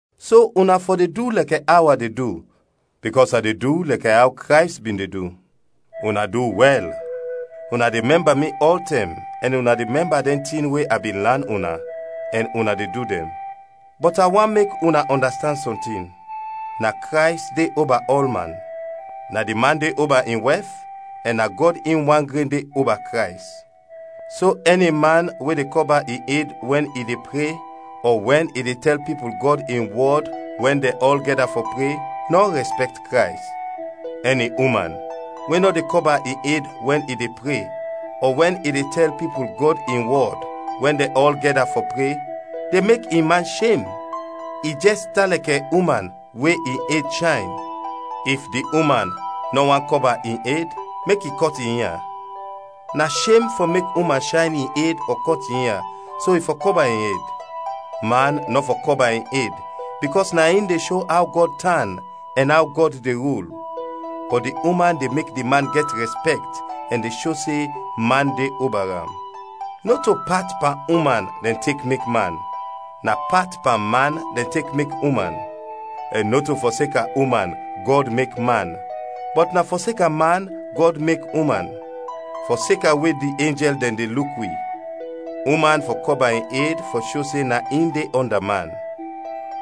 So una fɔ de du lɛkɛ aw a de du, bikɔs a de du lɛkɛ aw Krays bin de du. Una du wɛl: una de mɛmba mi ɔltɛm ɛn una de mɛmba dɛn tin we a bin lan una, ɛn una de du dɛn. Bɔt a want mek una ɔndastand sɔntin: Na Krays de oba ɔlman, na di man de oba in wɛf, ɛn na Gɔd in wan gren de oba Krays. So ɛni man we de kɔba in ed wɛn i de pre ɔ wɛn i de tɛl pipul Gɔd in wɔd wɛn dɛn ɔl gɛda fɔ pre, nɔ rɛspɛkt Krays. Ɛni uman we nɔ de kɔba in ed wɛn i de pre ɔ wɛn i de tɛl pipul Gɔd in wɔd wɛn dɛn ɔl gɛda fɔ pre, de mek in man shem, i jɛs tan lɛkɛ uman we in ed shayn. If di uman nɔ want kɔba in ed, mek i kɔt in ia. Na shem fɔ mek uman shayn in ed ɔ kɔt in ia, so i fɔ kɔba in ed. Man nɔ fɔ kɔba in ed bikɔs na in de sho aw Gɔd tan ɛn aw Gɔd de rul, bɔt di uman de mek di man gɛt rɛspɛkt ɛn de sho se man de oba am. Nɔto pat pan uman dɛn tek mek man, na pat pan man dɛn tek mek uman. Ɛn nɔto fɔseka uman Gɔd mek man, bɔt na fɔseka man Gɔd mek uman. Fɔseka we di enjɛl dɛn de luk wi, uman fɔ kɔba in ed fɔ sho se na in de ɔnda man.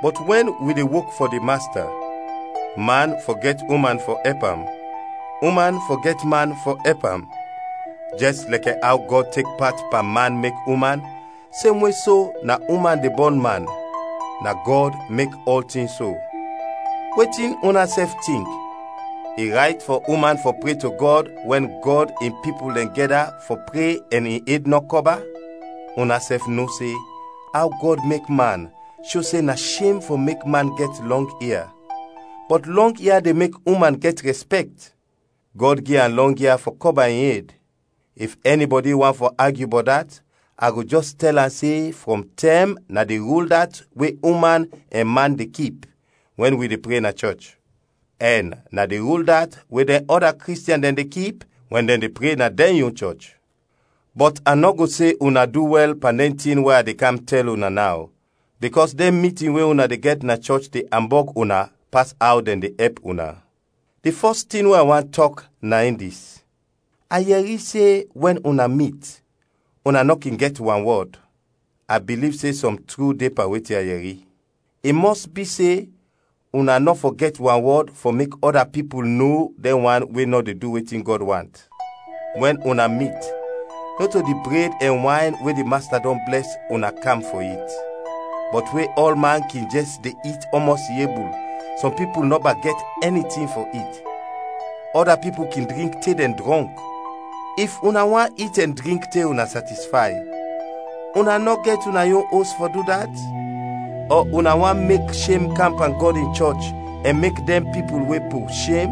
Bɔt wɛn wi de wok fɔ di Masta, man fɔ gɛt uman fɔ ɛp am, uman fɔ gɛt man fɔ ɛp am. Jɛs lɛkɛ aw Gɔd tek pat pan man mek uman, semwe so na uman de bɔn man; na Gɔd mek ɔltin so. Wetin unasɛf tink, i rayt fɔ uman fɔ pre to Gɔd wɛn Gɔd in pipul dɛn gɛda fɔ pre ɛn in ed nɔ kɔba? Unasɛf no se aw Gɔd mek man sho se na shem fɔ mek man gɛt lɔng ia, bɔt lɔng ia de mek uman gɛt rɛspɛkt. Gɔd gi am lɔng ia fɔ kɔba in ed. If ɛnibɔdi want fɔ agyu bɔt dat, a go jɛs tɛl am se frɔm tɛm na di rul dat we uman ɛn man de kip wɛn wi de pre na wi chɔch, ɛn na di rul dat we dɛn ɔda Kristiɛn dɛn de kip wɛn dɛn de pre na dɛn yon chɔch. Bɔt a nɔ go se una du wɛl pan dɛn tin we a de kam tɛl una naw, bikɔs dɛn mitin we una de gɛt na chɔch de ambɔg una pas aw dɛn de ɛp una. Di fɔs tin we a want tɔk na in dis: a yɛri se wɛn una mit, una nɔ kin gɛt wanwɔd; a biliv se sɔm tru de pan wetin a yɛri. I mɔs bi se una nɔ fɔ gɛt wanwɔd fɔ mek ɔda pipul no dɛn wan we de du wetin Gɔd want. Wɛn una mit nɔto di bred ɛn wayn we di Masta dɔn blɛs, una kam fɔ it. Bɔt we ɔlman kin jɛs de it ɔmɔs i ebul, sɔm pipul nɔba gɛt ɛni tin fɔ it; ɔda pipul kin drink te dɛn drɔnk. If una want it ɛn drink te una satisfay, una nɔ gɛt una yon os fɔ du dat? Ɔ una want mek shem kam pan Gɔd in chɔch ɛn mek dɛn pipul we po, shem?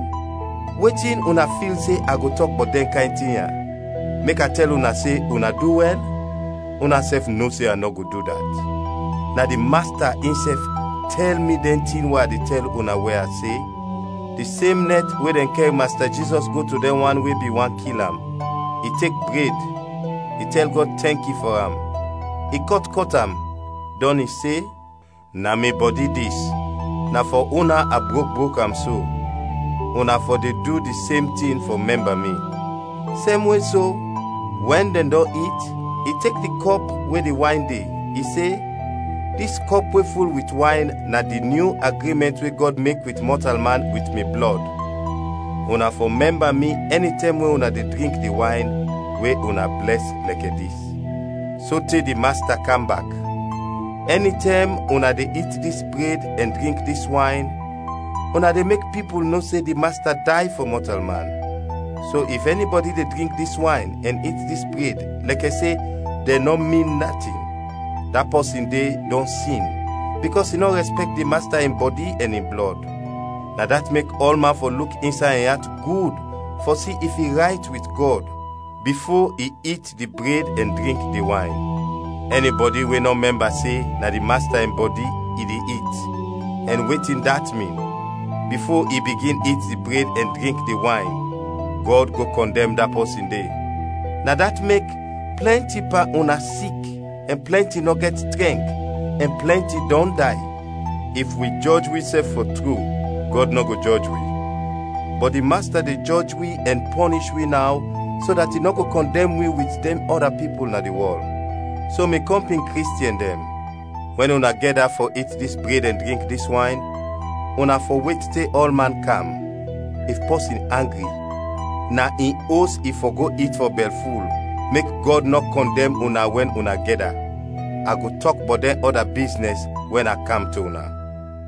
Wetin una fil se a go tɔk bɔt dɛn kayn tin ya? Mek a tɛl una se una du wɛl? Unasɛf no se a nɔ go du dat. Na di Masta insɛf tɛl mi dɛn tin we a tɛl una we a se: di sem nɛt we dɛn kɛr Masta Jizɔs go to dɛn wan we bin want kil am, i tek bred, i tɛl Gɔd tɛnki fɔ am, i kɔt am, kɔt am, dɔn i se, “Na mi bɔdi dis, na fɔ una a brok brok am so. Una fɔ de du di sem tin fɔ mɛmba mi.” Semwe so, wɛn dɛn dɔn it, i tek di kɔp we di wayn de, i se, “Dis kɔp we ful wit wayn na di nyu agrimɛnt we Gɔd mek wit mɔtalman wit mi blɔd. Una fɔ mɛmba mi ɛnitɛm we una de drink di wayn we una blɛs lɛkɛ dis.” Sote di Masta kam bak, ɛnitɛm una de it dis bred ɛn drink dis wayn, una de mek pipul no se di Masta day fɔ mɔtalman. So, if ɛnibɔdi de drink dis wayn ɛn it dis bred lɛkɛ se dɛn nɔ min natin, da pɔsin de dɔn sin bikɔs i nɔ rɛspɛkt di Masta in bɔdi ɛn in blɔd. Na dat mek ɔlman fɔ luk insay in at gud fɔ si if i rayt wit Gɔd, bifo i it di bred ɛn drink di wayn. Ɛnibɔdi we nɔ mɛmba se na di Masta in bɔdi i de it ɛn wetin dat min, bifo i bigin it di bred ɛn drink di wayn, Gɔd go kɔndɛm da pɔsin de. Na dat mek plɛnti pan una sik ɛn plɛnti nɔ gɛt trɛnk, ɛn plɛnti dɔn day. If wi jɔj wisɛf fɔ tru, Gɔd nɔ go jɔj wi. Bɔt di Masta de jɔj wi ɛn pɔnish wi naw so dat i nɔ go kɔndɛm wi wit dɛn ɔda pipul na di wɔl. So, mi kɔmpin Kristiɛn dɛn, wɛn una gɛda fɔ it dis bred ɛn drink dis wayn, una fɔ wet te ɔlman kam. If pɔsin angri, na in os i fɔ go it fɔ bɛlful, mek Gɔd nɔ go kɔndɛm una wɛn una gɛda. A go tɔk bɔt dɛn ɔda biznɛs wɛn a kam to una.